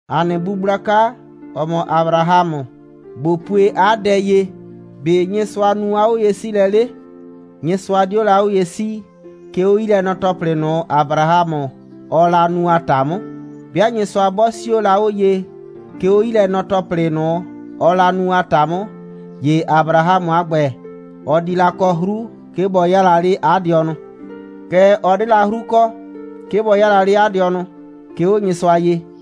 ‑A nɩ bu gblaka, ‑ɔ mɔ Abrahamʋ, ꞊bo pue 'a dɛ ye. ‑Be' Nyɩsʋa nu 'a 'oye'siilɛ 'le? Nyɩsʋa 'dio la 'o ye 'sii, 'ke 'o 'yilɛnɔ‑tɔplɩ ꞊nʋ, Abrahamʋ, ɔɔ la nu a ‑ta 'mʋ. 'Bɩa Nyɩsʋa 'bɔ 'sio la 'o ye, 'ke 'o 'yilɛnɔ‑tɔplɩ ꞊nʋ, ɔɔ la nu a ‑ta 'mʋ, ‑ye Abrahamʋ a ‑gbɛ, ɔ di la kɔ 'hru, 'ke bɔ 'yaa la 'le 'a dɩɔnʋ. Kɛɛ, ɔ 'de la 'hru kɔ, 'ke bɔ 'yaa la 'le 'a dɩɔnʋ, 'ke 'o Nyɩsʋa ye.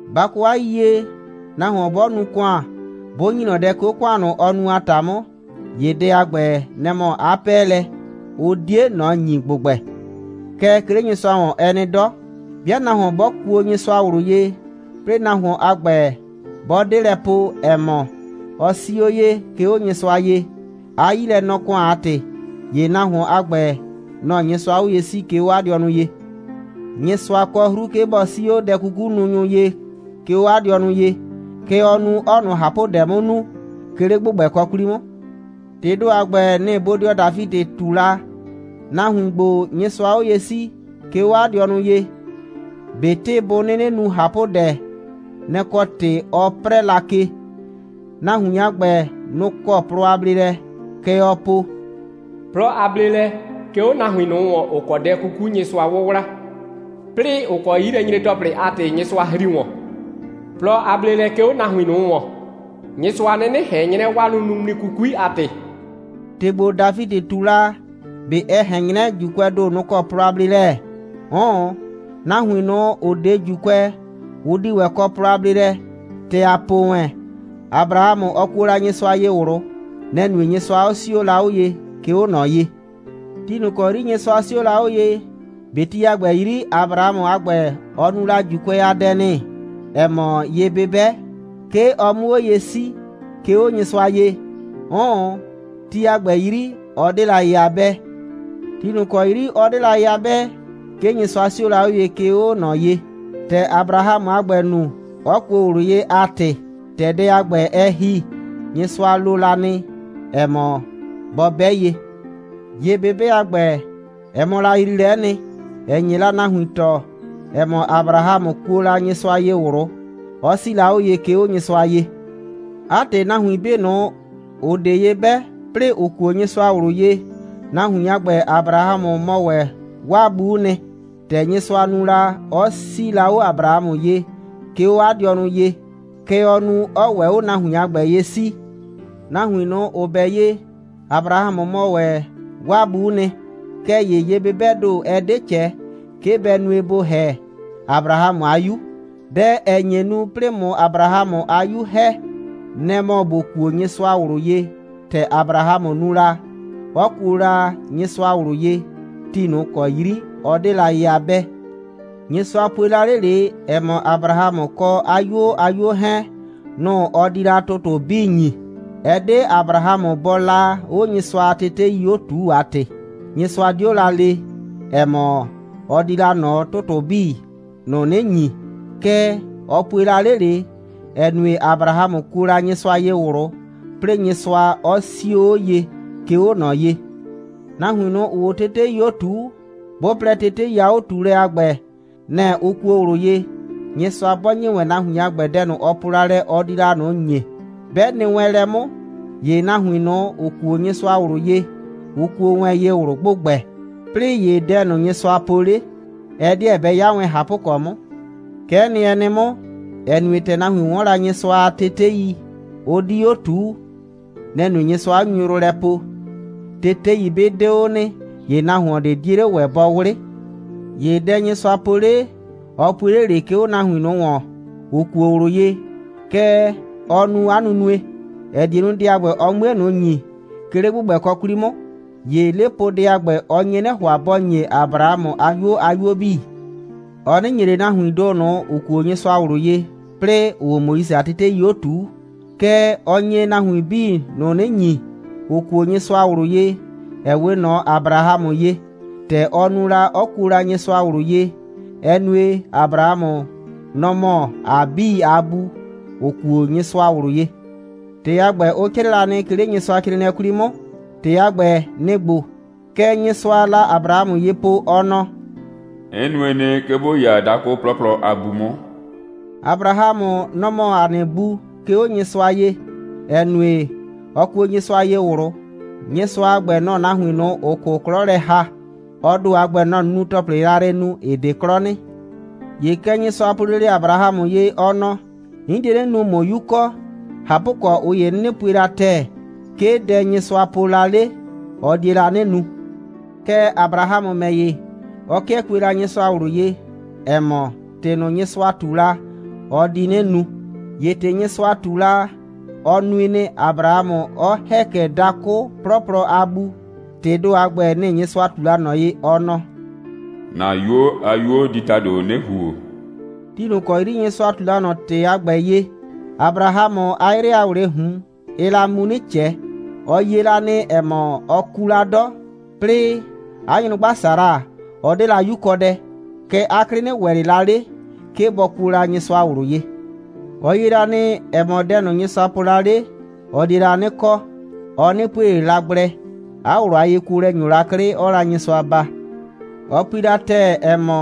Ba kɔ 'a yiyie, nahuon 'bɔ nu ‑kʋan, 'bʋ ‑nyi ꞊nɔ dɛ, 'ke 'o ‑kʋan ꞊nʋ, ɔ nu a ‑ta 'mʋ, ‑ye dɛ a ‑gbɛ, nɛ‑ mɔ 'a 'pɛɛlɛ. Ʋ 'die ꞊nɔ ‑nyi ‑gbʋgbɛ. Kɛɛ, 'ke 'le Nyɩsʋa ‑wɔn, ɛ nɩ 'dɔ. 'Bɩa nahuon 'bɔ kuo Nyɩsʋa ꞊wlʋ ye, 'plɩɩ nahuon a ‑gbɛ, 'bɔ 'de lɛ po, ‑ɛ mɔ, ɔ 'sii 'o ye, 'ke 'o Nyɩsʋa ye, 'a 'yilɛnɔ‑kʋan a ‑tɩ, ‑ye nahuon a ‑gbɛ, nɔ‑ Nyɩsʋaa 'o ye 'sii, 'ke 'o 'a dɩɔnʋ ye. Nyɩsʋa kɔ 'hru, 'ke bɔ 'sii 'o dɛ'kukununyʋ ye, 'ke 'o 'a dɩɔnʋ ye. Kɛ ɔɔ nu, 'ɔɔ ꞊nʋ ꞊hapʋdɛ 'mʋ nu, 'ke 'le ‑gbʋgbɛkɔ 'kwli 'mʋ. ‑Tɩɩ ‑do a ‑gbɛ, nɩ‑ bodɩɔ Dafidɩ ꞊tu la. Nahuin ‑gbo, Nyɩsʋaa 'o ye 'sii, 'ke 'o 'a dɩɔnʋ ye, ꞊betɩ bʋ 'nɩnɩ nu ꞊hapʋdɛ, nɛ‑ kɔ ‑tɩ ɔ 'prɛɛ la ke. Nahuin a ‑gbɛ, nʋ‑ kɔ plɔ a bleelɛ. Kɛ ɔɔ po: «Plɔ a bleelɛ, 'ke 'o nahuin ꞊nʋ ‑wɔn, ‑ʋ kɔ dɛ 'kuku Nyɩsʋa 'wʋwla, 'plɩɩ, ‑ʋ kɔ 'yilɛnyre‑tɔplɩ a ‑tɩ Nyɩsʋa ‑hri ‑wɔn. Plɔ a bleelɛ, 'ke 'o nahuin ꞊nʋ ‑wɔn, Nyɩsʋa 'nɩnɩ ꞊hɛn 'nyrɛ, 'waa nunuŋmli 'kukui a ‑tɩ.» ‑Tɩ ‑gbo, Dafidɩ ꞊tu la, ꞊be ɛ ꞊hɛn 'nyrɛ, ‑Juukʋɛɛ ‑do, nʋ‑ kɔ plɔ a bleelɛ? 'Ʋʋn, nahuin ꞊nʋ, ‑ʋ 'de ‑Juukʋɛ, ʋ di ‑wɛ kɔ plɔ a bleelɛ. ‑Tɛ ‑a po wɛn, Abrahamʋ, ɔ kuo la Nyɩsʋa ye ꞊wlʋ. Nɛ‑ nue, Nyɩsʋa 'ɔ 'sio la 'o ye, 'ke 'o ꞊nɔ ye. Ti ꞊nʋ ‑kɔ 'yri Nyɩsʋa 'sio la 'o ye, ꞊be ti a ‑gbɛ 'yri, Abrahamʋ a ‑gbɛ, ɔ nu la ‑Juukʋɛ a dɛ nɩ, ‑ɛ mɔ ye'bɩbɛ, 'ke ɔ 'mʋ 'o ye 'sii, 'ke 'o Nyɩsʋa ye. 'Ʋʋn, ti a ‑gbɛ 'yri, ɔ 'de la ye a 'bɛɛ. Ti ꞊nʋ ‑kɔ 'yri ɔ 'de la ye a 'bɛɛ, 'ke Nyɩsʋa 'sio la 'o ye, 'ke 'o ꞊nɔ ye, ‑tɛ Abrahamʋ a ‑gbɛ nu, 'ɔ kuo ꞊wlʋ ye a ‑tɩ. ‑Tɛ dɛ a ‑gbɛ, ɛ ‑hi, Nyɩsʋa lo la nɩ, ‑ɛ mɔ, bɔ 'bɛ ye. Ye'bɩbɛ a ‑gbɛ, ɛ mɔ la yriilɛ'ɛ nɩ, ‑ɛ nye la nahuin tɔɔ, ‑ɛ mɔ, Abrahamʋ kuo la Nyɩsʋa ye ꞊wlʋ, 'ɔ 'sii la 'o ye, 'ke 'o Nyɩsʋa ye. 'A ‑tɩ, nahuin 'bii ꞊nʋ, ‑ʋ 'de ye 'bɛ, 'plɩɩ ‑ʋ kuo Nyɩsʋa ꞊wlʋ ye, nahuin a ‑gbɛ, Abrahamʋ mɔ ‑wɛ 'waa bu'u nɩ. ‑Tɛ Nyɩsʋa nu la, 'ɔ 'sii la 'o Abrahamʋ ye, 'ke 'o 'a dɩɔnʋ ye, kɛ ɔɔ nu, 'ɔɔ ‑wɛ 'o nahuin a ‑gbɛ ye 'sii. Nahuin ꞊nʋ, ‑ʋ 'bɛ ye, Abrahamʋ mɔ ‑wɛ 'waa bu'u nɩ. Kɛɛ ‑ye ye'bɩbɛɛ ‑do, ɛ 'de ꞊cɛ, 'ke bɛ nue, ‑bo ‑hɛ Abrahamʋ a 'yu. Dɛ, ‑ɛ nye nu, 'plɩɩ ꞊mʋ Abrahamʋ a 'yu ‑hɛ, nɛ‑ mɔ ‑bo kuo Nyɩsʋa ꞊wlʋ ye, ‑tɛ Abrahamʋ nu la, 'ɔ kuo la Nyɩsʋa ꞊wlʋ ye, ti ꞊nʋ ‑kɔ 'yri ɔ 'de la ye a 'bɛɛ. Nyɩsʋa pue la 'le ꞊le, ‑ɛ mɔ, Abrahamʋ kɔ 'a 'yuo a 'yuo 'hɛɛn, nʋ‑ ɔ di la ‑tʋtʋ 'bii ‑nyi. Ɛ 'de Abrahamʋ bɔɔ la 'o Nyɩsʋa a tetei 'o ꞊tuu a ‑tɩ, Nyɩsʋa 'dio la le, ‑ɛ mɔ, ɔ di la ꞊nɔ ‑tʋtʋ 'bii ꞊nʋ 'nɩ ‑nyi. Kɛɛ, ɔ pue la 'le ꞊le, ‑ɛ nue, Abrahamʋ kuo la Nyɩsʋa ye ꞊wlʋ, 'plɩɩ Nyɩsʋa 'ɔ 'sio 'o ye, 'ke 'o ꞊nɔ ye. Nahuin ꞊nʋ, ‑ʋʋ 'o tetei 'o ꞊tuu, 'bʋ plɛ, tetei a 'o꞊tuulɛ a ‑gbɛ, nɛ‑ ʋ kuo ꞊wlʋ ye, Nyɩsʋa 'bɔ ‑nyi wɛn nahuin a ‑gbɛ dɛ ꞊nʋ, ɔ po la lɛ, ɔ di la ꞊nʋ ‑nyi, 'bɛ nɩ wɛn lɛ 'mʋ, ‑ye nahuin ꞊nʋ, ‑ʋ kuo Nyɩsʋa ꞊wlʋ ye, ʋ kuo wɛn ye ꞊wlʋ ‑gbʋgbɛ, 'plɩɩ ‑ye dɛ ꞊nʋ, Nyɩsʋa po 'le, ɛ 'deɛ bɛ 'ya wɛn ꞊hapʋkɔ 'mʋ. Kɛ'ɛ nɩ, ɛ nɩ 'mʋ, ‑ɛ nue, ‑tɛ nahuin 'wɔn la Nyɩsʋa a tetei, ʋ 'di 'o ꞊tuu. Nɛ‑ nue, Nyɩsʋa 'ɔ nyu yrʋ lɛ poo. Tetei 'bɩ 'de 'o nɩ, ‑ye nahuon ꞊de 'die 'le ‑wɛ bɔ 'wlɩ. ‑Ye dɛ Nyɩsʋa po 'le, ɔ pue 'le ꞊le, 'ke 'o nahuin ꞊nʋ ‑wɔn, ‑ʋ kuo ꞊wlʋ ye. Kɛ ɔ nu 'a nunue, ‑ɛ die nu, dɛ a ‑gbɛ, ɔ 'mue ꞊nʋ ‑nyi, 'ke 'le ‑gbʋgbɛkɔ 'kwli 'mʋ. ‑Ye 'lepoodɛ a ‑gbɛ, ɔ nye 'nɩ ‑hʋa, bɔ ‑nye Abrahamʋ a 'yuo a 'yuo 'bii. Ɔ 'nɩ ‑nye ꞊le nahuiin ‑do ꞊nʋ, ‑ʋ kuo Nyɩsʋa ꞊wlʋ ye, 'plɩɩ ‑ʋʋ 'o Moise a tetei 'o ꞊tuu. Kɛɛ, ɔ nye nahuin 'bii ꞊nʋ 'nɩ ‑nyi, ‑ʋ kuo Nyɩsʋa ꞊wlʋ ye, ‑ɛ 'we ꞊nɔ Abrahamʋ ye, ‑tɛ ɔ nu la, 'ɔ kuo la Nyɩsʋa ꞊wlʋ ye, ‑ɛ nue, Abrahamʋ, nɔ‑ mɔ ‑a 'bii a bu, ‑ʋ kuo Nyɩsʋa ꞊wlʋ ye. ‑Tɩ a ‑gbɛ, ʋ 'crɩɩ la nɩ, 'ke 'le Nyɩsʋacrɩɩnɩɛ 'kwli 'mʋ. ‑Tɩ a ‑gbɛ, nɩ‑ ‑gbo: Kɛ Nyɩsʋaa la Abrahamʋ ye po, ɔ nɔ: «'N nue nɩ, 'ke ‑bo 'ya dakʋ 'plɔplɔ a bu 'mʋ.» Abrahamʋ, nɔ‑ mɔ ‑a nɩ bu, 'ke 'o Nyɩsʋa ye, ‑ɛ nue, ɔ kuo Nyɩsʋa ye ꞊wlʋ. Nyɩsʋa a ‑gbɛ, nɔ‑ɔ nahuin ꞊nʋ, ‑ʋ 'kʋ 'klɔ lɛ ‑ha. Ɔ ‑do a ‑gbɛ, nɔ‑ɔ nunu‑tɔplɩ yrayrɩ nu, ‑ɩ 'de 'klɔ nɩ. ‑Ye kɛ Nyɩsʋa po la lele Abrahamʋ ye, ɔ nɔ: «'N die 'nɩ nu, ꞊mʋ 'yu kɔ.» ꞊Hapʋkɔ, ꞊ʋ ‑ye 'ʋ 'nɩnɩ pue la ‑tɛɛ, 'ke dɛ Nyɩsʋa po la 'le, ɔ die la 'nɩ nu. Kɛɛ, Abrahamʋ ‑mɛ ‑ye, ɔ 'kɩɛ kue la Nyɩsʋa ꞊wlʋ ye, ‑ɛ mɔ, ‑tɩ ꞊nʋ, Nyɩsʋa ꞊tu la, ɔ di 'nɩ nu. ‑Ye ‑tɩ Nyɩsʋa ꞊tu la, ɔ nui nɩ, Abrahamʋ 'ɔ ‑hɛ kɛ dakʋ 'plɔplɔ a bu. ‑Tɩɩ ‑do a ‑gbɛ, nɩ‑ Nyɩsʋa ꞊tu la ꞊nɔ ye, ɔ nɔ: «‑Na 'yuo a 'yuo di ‑tado 'nɩ ‑huo.» Ti ꞊nʋ ‑kɔ 'yri Nyɩsʋa ꞊tu la ꞊nɔ ‑tɩ a ‑gbɛ ye, Abrahamʋ, 'a 'yrɩ a ‑wlɩɩ ꞊hun, ɩɩ la mu 'nɩ ꞊cɛ. Ɔ yie la nɩ, ‑ɛ mɔ, ɔ ku la 'dɔ, 'plɩɩ 'a nyrʋgba Sara, ɔ 'de la 'yukɔdɛ. Kɛɛ, 'a 'klɩ 'nɩ ‑wɛ ꞊le la 'le, 'ke bɔ kuo la Nyɩsʋa ꞊wlʋ ye. Ɔ yie la nɩ, ‑ɛ mɔ, dɛ Nyɩsʋa po la 'le, ɔ die la 'nɩ kɔ, ɔ 'nɩ pue ꞊le la gblɛ. 'A ꞊wlʋ a yekuolɛ ‑nyo la 'klɩ, 'ɔɔ la Nyɩsʋa baa. Ɔ pui la ‑tɛɛ, ‑ɛ mɔ,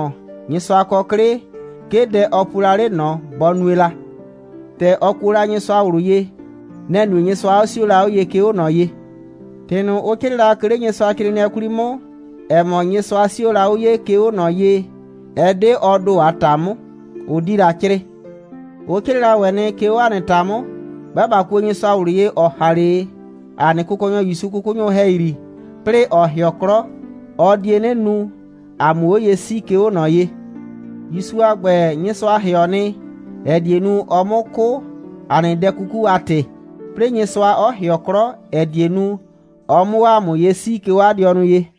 Nyɩsʋa kɔ 'klɩ, 'ke dɛ ɔ pue la 'le ꞊nɔ, bɔ nue la. ‑Tɛ ɔ kuo Nyɩsʋa ꞊wlʋ ye, nɛ‑ nue, Nyɩsʋa 'ɔ 'sio la 'o ye, 'ke 'o ꞊nɔ ye. ‑Tɩ ꞊nʋ, ʋ 'crɩɩ la, 'ke 'le Nyɩsʋacrɩɩnɩɛ 'kwli 'mʋ, ‑ɛ mɔ, Nyɩsʋa 'sio la 'o ye, 'ke 'o ꞊nɔ ye, ɛ 'de ɔ ‑do a ‑ta 'mʋ, ʋ 'di la 'crɩɩ. Ʋ 'crɩɩ la ‑wɛ nɩ, 'ke 'o ‑a nɩ ‑ta 'mʋ. 'Bɩa ꞊ba kuo Nyɩsʋa ꞊wlʋ ye, ‑ɔ ‑ha 'le ‑a nɩ Kʋkɔnyɔ ‑Yusu 'kʋkʋnyʋ ‑hɛyri, 'plɩɩ ‑ɔ ‑hɩɔ 'klɔ, ɔ die 'nɩ nu, ‑a 'mʋ 'o ye 'sii, 'ke 'o ꞊nɔ ye. ‑Yusu a ‑gbɛ, Nyɩsʋa ‑hɩɔ nɩ, ‑ɛ die nu, ɔ 'mʋ 'kʋ, ‑a nɩ dɛ 'kuku a ‑tɩ, 'plɩɩ Nyɩsʋa 'ɔ ‑hɩɔ 'klɔ, ‑ɛ die nu, ɔ 'mʋ 'o ‑a mʋ ye 'sii, 'ke 'o 'a dɩɔnʋ ye.